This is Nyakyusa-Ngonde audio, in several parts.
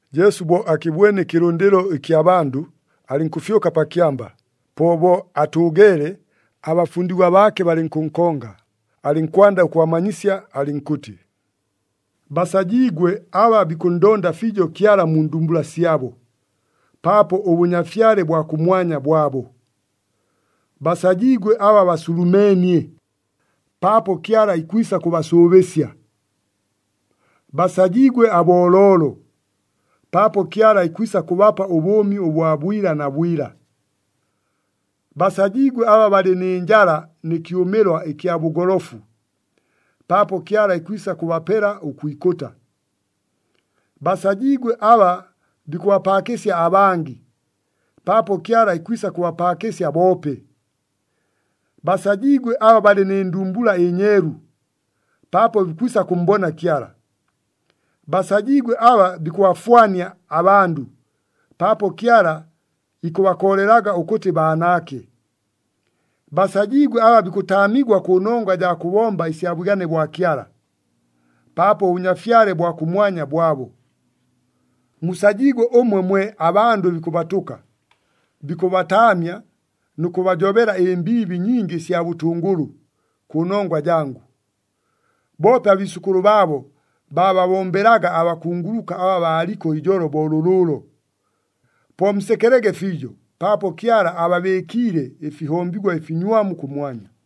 Jesu bo akɨbwene ɨkɨlʉndɨlo ɨkya bandʉ, alɨnkʉfyʉka pa kyamba. Po bo atʉʉgeele, abafundigwa baake balɨnkʉnkonga, alɨnkwanda ʉkʉbamanyisya, alɨnkʉtɨ, “Basajiigwe aba bikʉnndonda fiijo Kyala mu ndumbula syabo, paapo ʉBʉnyafyale bwa kʉmwanya bwabo. Basajiigwe aba basulumeenie, paapo Kyala ikwisa kʉbasʉʉbɨsya. Basajiigwe abooloolo, paapo Kyala ikwisa kʉbapa ʉbʉʉmi bwa bwila na bwila. Basajiigwe aba balɨ nɨ njala nɨ kyʉmɨlwa ɨkya bʉgolofu, paapo Kyala ikwisa kʉbapela ʉkwikʉta. Basajiigwe aba bikʉbapaakɨsya abangɨ, paapo Kyala ikwisa kʉbapaakɨsya boope. Basajiigwe aba balɨ nɨ ndumbula ɨnyeelu, paapo bikwisa kʉmmbona Kyala. Basajiigwe aba bikʉbafwania abandʉ, paapo Kyala ikʉbakoolelaga ʉkʉtɨ baanaake. Basajiigwe aba bikʉtaamigwa kʉnongwa jaa kʉbomba ɨsya bwigane bwa Kyala, paapo ʉBʉnyafyale bwa kʉmwanya bwabo. “Musajiigwe ʉmwe mwe abandʉ bikʉbatʉka, bikʉbataamya nʉ kʉbajobela ɨmbiibi nyingi ɨsya bʉtʉngʉlʉ, kʉnongwa jangʉ. Boope abiisʉkʉlʉ baabo, baababombelaga abakunguluka aba baaliko ijolo bo lʉlʉʉlo. Po musekelege fiijo, paapo Kyala ababɨɨkiile ɨfihombigwa ɨfinywamu kʉmwanya.”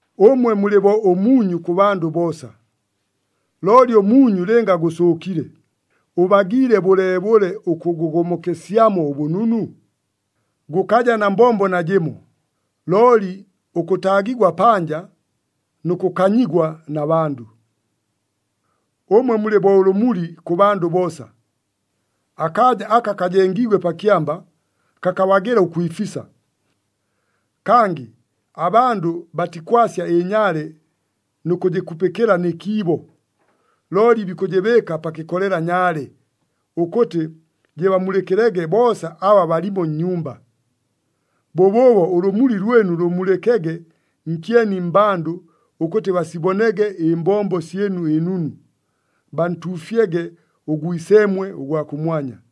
“Ʉmwe mulɨ bo ʉmuunyu kʉ bandʉ boosa. Looli ʉmuunyu lɨnga gʉsʉʉkile, ʉbagiile bʉleebʉle ʉkʉgomokesyamo ʉbʉnunu? Gʉkaja na mbombo najɨmo, looli ʉkʉtaagigwa panja nʉ kʉkanyigwa na bandʉ. “Ʉmwe mulɨ bo ʉlʉmuli kʉ bandʉ boosa. Akaaja aka kajengiigwe pa kyamba, kakabagɨla ʉkwifisa. Kangɨ abandʉ batikwasya ɨnyaale nʉ kʉjɨkupɨkɨla nɨ kiibo, looli bikʉjɨbɨɨka pa kɨkolela nyaale, ʉkʉtɨ jɨbamulɨkɨlege boosa aba balimo nnyumba. Bʉbʉʉbo ʉlʉmuli lwɨnu lʉmulɨkege nkyeni mmbandʉ ʉkʉtɨ basibonege ɨmbombo syɨnu ɨnunu, bantuufyege ʉGwiseemwe ʉgwa kʉmwanya.”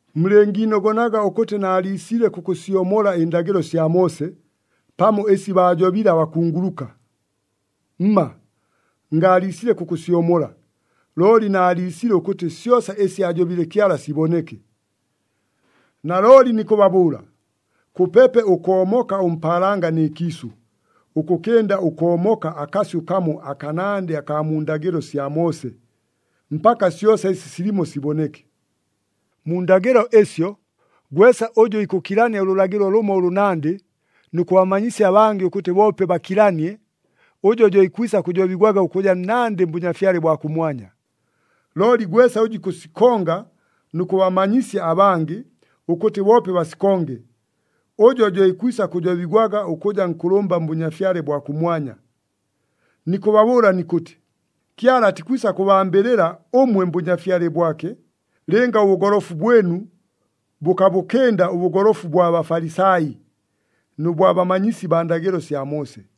“Mulɨngiinogonaga ʉkʉtɨ naaliisile kʉkʉsyomola ɨndagɨlo sya Moose, pamo ɨsi baajobile abakunguluka. Mma, ngaaliisile kʉkʉsyomola, looli naaliisile ʉkʉtɨ syosa ɨsi aajobile Kyala siboneke. Nalooli nikʉbabʉʉla, kʉpepe ʉkoomoka ʉmpaalanga nɨ kiisʉ, ʉkʉkɨnda ʉkoomoka akasyʉ kamo akanandɨ akaa mu ndagɨlo sya Moose, mpaka syosa ɨsi silimo siboneke. Mu ndagɨlo ɨsyo, gwesa ʉjʉ ikʉkilania ʉlʉlagɨlo lʉmo ʉlʉnandɨ, nʉ kʉbamanyisya abangɨ ʉkʉtɨ boope bakilanie, ʉjo jo ikwisa kʉjobigwaga ʉkʉja nnandɨ mBʉnyafyale bwa kʉmwanya. Looli gwesa ʉjʉ ikʉsikonga nʉ kʉbamanyisya abangɨ, ʉkʉtɨ boope basikonge, ʉjo jo ikwisa kʉjobigwaga ʉkʉja nkʉlʉmba mBʉnyafyale bwa kʉmwanya. Nikʉbabʉʉla nikʉtɨ, Kyala atikwisa kʉbambɨlɨla ʉmwe mBʉnyafyale bwake, lɨnga ʉbʉgolofu bwɨnu bʉkabʉkɨnda ʉbʉgolofu bwa Bafalisai, nʉ bwa bamanyisi baa ndagɨlo sya Moose.”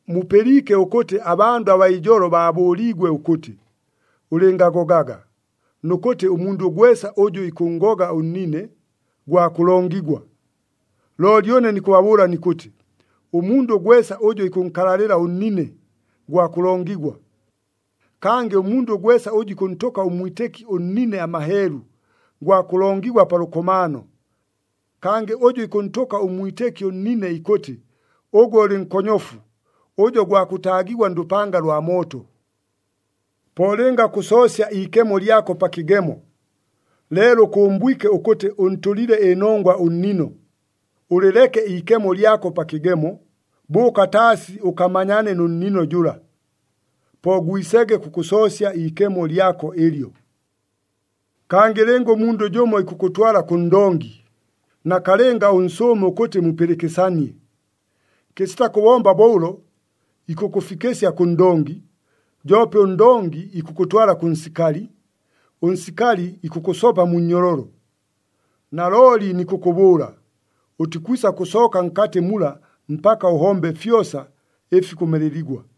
“Mupɨliike ʉkʉtɨ abandʉ abaa ijolo baabʉʉliigwe ʉkʉtɨ, ‘Ʉlɨngagogaga, nʉ kʉtɨ ʉmundʉ gwesa ʉjʉ ikʉnngoga ʉnnine, gwa kʉlongigwa.’ Looli ʉne nikʉbabʉʉla nikʉtɨ, ʉmundʉ gwesa ʉjʉ ikʉnkalalɨla ʉnnine, gwa kʉlongigwa. Kangɨ ʉmundʉ gwesa ʉjʉ ikʉntʉka ʉmwitɨki ʉnnine amaheelu, gwa kʉlongigwa pa lʉkomaano. Kangɨ ʉjʉ ikʉntʉka ʉmwitɨki ʉnnine ikʉtɨ, ‘Ʉgwe ʉlɨ nkonyofu,’ ʉjo gwa kʉtaagigwa ndʉpanga lwa mooto! “Po lɨnga kʉsoosya iikemo lyako pa kɨgemo, leelo ʉkʉmbwike ʉkʉtɨ ʉntʉlile ɨnongwa ʉnnino, ʉlɨleke iikemo lyako pa kɨgemo, bʉʉka taasi ʉkamanyane nʉ nnino jʉla. Po gwisege kʉkʉsoosya iikemo lyako ɨlyo. “Kangɨ lɨnga ʉmundʉ jʉmo ikʉkʉtwala kʉ ndongi, nakalɨnga ʉnsʉʉme ʉkʉtɨ mupɨlɨkɨsanie. Kɨsita kʉbomba bo ʉlo, ikʉkʉfikɨsya kʉ ndongi, joope ʉndongi ikʉkʉtwala kʉ nsikali, ʉnsikali ikʉkʉsopa mu nnyololo. Nalooli nikʉkʉbʉʉla, ʉtikwisa kʉsooka nkatɨ mula mpaka ʉhombe fyosa, ɨfi kʉmeleligwa!”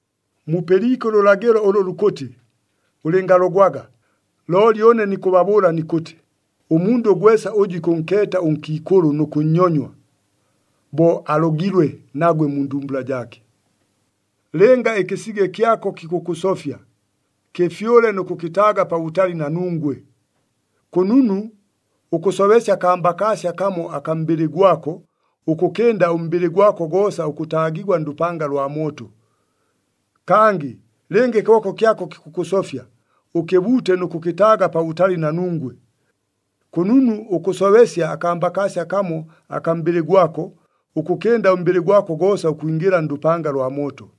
“Mupɨliike ʉlʉlagɨlo ʉlʉ lukʉtɨ, ‘Ʉlɨngalogwaga.’ Looli ʉne nikʉbabʉʉla nikʉtɨ, ʉmundʉ gwesa ʉjʉ ikʉnkeeta ʉnkiikʉlʉ nʉ kʉnnyonywa, bo alogilwe nagwe mu ndumbula jaake. Lɨnga ɨkɨsige kyako kikʉkʉsofya, kɨfyʉle nʉ kʉkɨtaaga pabʉtali na nungwe! Kʉnunu ʉkʉsobesya akambakaasya kamo akaa mbɨlɨ gwako, ʉkʉkɨnda ʉmbɨlɨ gwako goosa ʉkʉtaagigwa ndʉpanga lwa mooto. Kangɨ lɨnga ɨkɨboko kyako kikʉkʉsofya, ʉkɨbuute nʉ kʉkɨtaaga pabʉtali na nungwe! Kʉnunu ʉkʉsobesya akambakaasya kamo akaa mbɨlɨ gwako, ʉkʉkɨnda ʉmbɨlɨ gwako goosa ʉkwingɨla ndʉpanga lwa mooto.”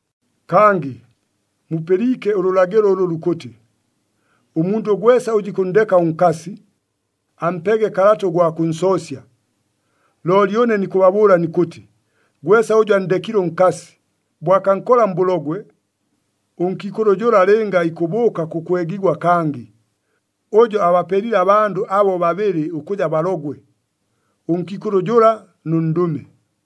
“Kangɨ mupɨliike ʉlʉlagɨlo ʉlʉ lukʉtɨ, ‘Ʉmundʉ gwesa ʉjʉ ikʉnndeka ʉnkasi, ampege kalata ʉgwa kʉnsoosya.’ Looli ʉne nikʉbabʉʉla nikʉtɨ, gwesa ʉjʉ anndekile ʉnkasi, bo akankola mbʉlogwe, ʉnkiikʉlʉ jʉla lɨnga ikʉbʉʉka kʉkwegigwa kangɨ, ʉjo abapelile abandʉ abo babɨlɨ ʉkʉja balogwe, ʉnkiikʉlʉ jʉla nʉ ndʉme.”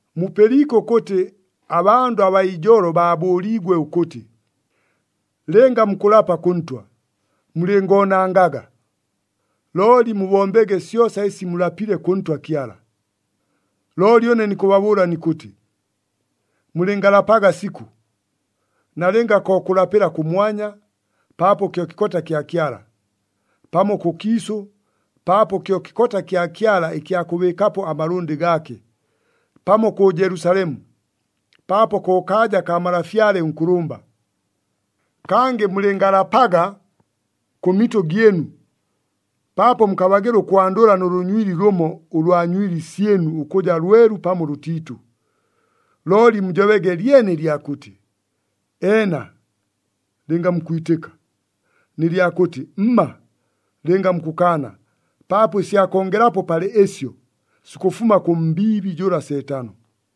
“Mupɨliike ʉkʉtɨ abandʉ abaa ijolo baabʉʉliigwe ʉkʉtɨ, ‘Lɨnga mukʉlapa kʉ Ntwa, mulɨngoonangaga. Looli mubombege syosa ɨsi mulapile kʉ Ntwa Kyala.’ Looli ʉne nikʉbabʉʉla nikʉtɨ, mulɨngalapaga sikʉ, nalɨnga ko kʉlapɨla kʉmwanya, paapo kyo kɨkota kya Kyala, pamo kʉkiisʉ, paapo kyo kɨkota kya Kyala ɨkya kʉbɨɨkapo amalʉndɨ gaake, pamo kʉ Jelusalemu, paapo ko kaaja kaa Malafyale ʉNkʉlʉmba. Kangɨ mulɨngalapaga kʉ mitʉ gyɨnu, paapo mukabagɨla ʉkwandʉla nʉ lʉnywili lʉmo ʉlwa nywili syɨnu ʉkʉja lwelu pamo lʉtiitʉ. Looli mujobege lyene ɨlya kʉtɨ, ‘Eena,’ lɨnga mukwitɨka, nɨ lyakʉtɨ, ‘Mma,’ lɨnga mukʉkaana, paapo ɨsya kongelapo palɨ ɨsyo, sikʉfuma kʉ mbiibi jʉla Seetano.”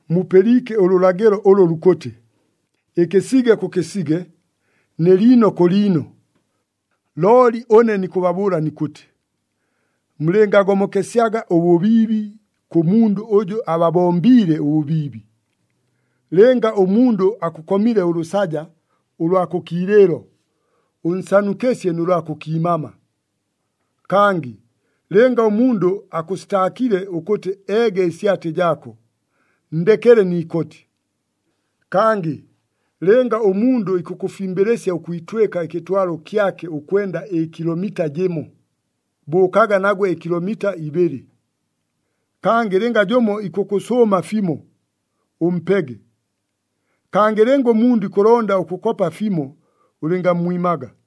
“Mupɨliike ʉlʉlagɨlo ʉlʉ lukʉtɨ, ‘Ɨkɨsige kʉ kɨsige nɨ liino kʉ liino.’ Looli ʉne nikʉbabʉʉla nikʉtɨ, mulɨngagomokesyaga ʉbʉbiibi kʉ mundʉ ʉjʉ ababombiile ʉbʉbiibi. Lɨnga ʉmundʉ akʉkomile ʉlʉsaja ʉlwa kʉ kiilɨɨlo, ʉnsanukɨsye nʉ lwa kʉ kiimama. Kangɨ lɨnga ʉmundʉ akʉsitaakile ʉkʉtɨ eege ɨsyatɨ jaako, nndekele ni ikoti. Kangɨ lɨnga ʉmundʉ ikʉkʉfimbɨlɨsya ʉkwitwɨka ɨkɨtwalo kyake ʉkwenda ɨkilomita jɨmo, bʉʉkaga nagwe ɨkilomita ibɨlɨ. Kangɨ lɨnga jʉmo ikʉkʉsʉʉma fimo, ʉmpege. Kangɨ lɨnga ʉmundʉ ikʉlonda ʉkʉkopa fimo, ʉlɨngammwimaga.”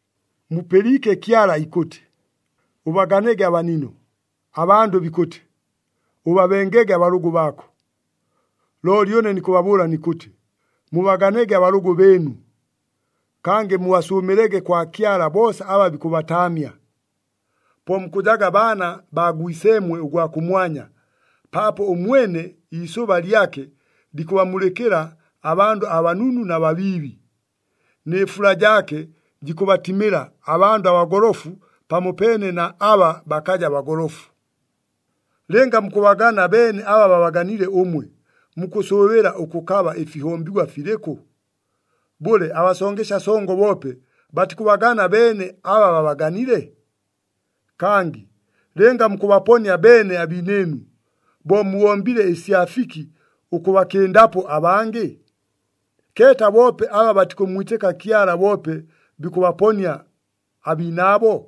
“Mupɨliike Kyala ikʉtɨ, ‘Ʉbaganege abanino,’ abandʉ bikʉtɨ, ‘Ʉbabengege abalʉgʉ baako.’ Looli ʉne nikʉbabʉʉla nikʉtɨ, mubaganege abalʉgʉ bɨɨnu. Kangɨ mubasʉʉmɨlege kwa Kyala boosa aba bikʉbataamya. Po mukʉjaga baana baa Gwiseemwe ʉgwa kʉmwanya, paapo ʉmwene iisʉba lyake likʉbamulɨkɨla abandʉ abanunu na babiibi, nɨ fula jaake jikʉbatimɨla abandʉ abagolofu pamopeene na aba bakaja bagolofu. Lɨnga mukʉbagana beene aba babaganile ʉmwe, mukʉsʉʉbɨla ʉkʉkaba ɨfihombigwa filɨkʉ? Bʉle, abasongesya songo boope batikʉbagana beene aba babaganile? Kangɨ lɨnga mukʉbaponia beene abiinɨɨnu, bo mubombile ɨsya fiki ʉkʉbakɨndapo abangɨ? Keeta boope aba batikʉmmwitɨka Kyala boope bikʉbaponia abiinaabo.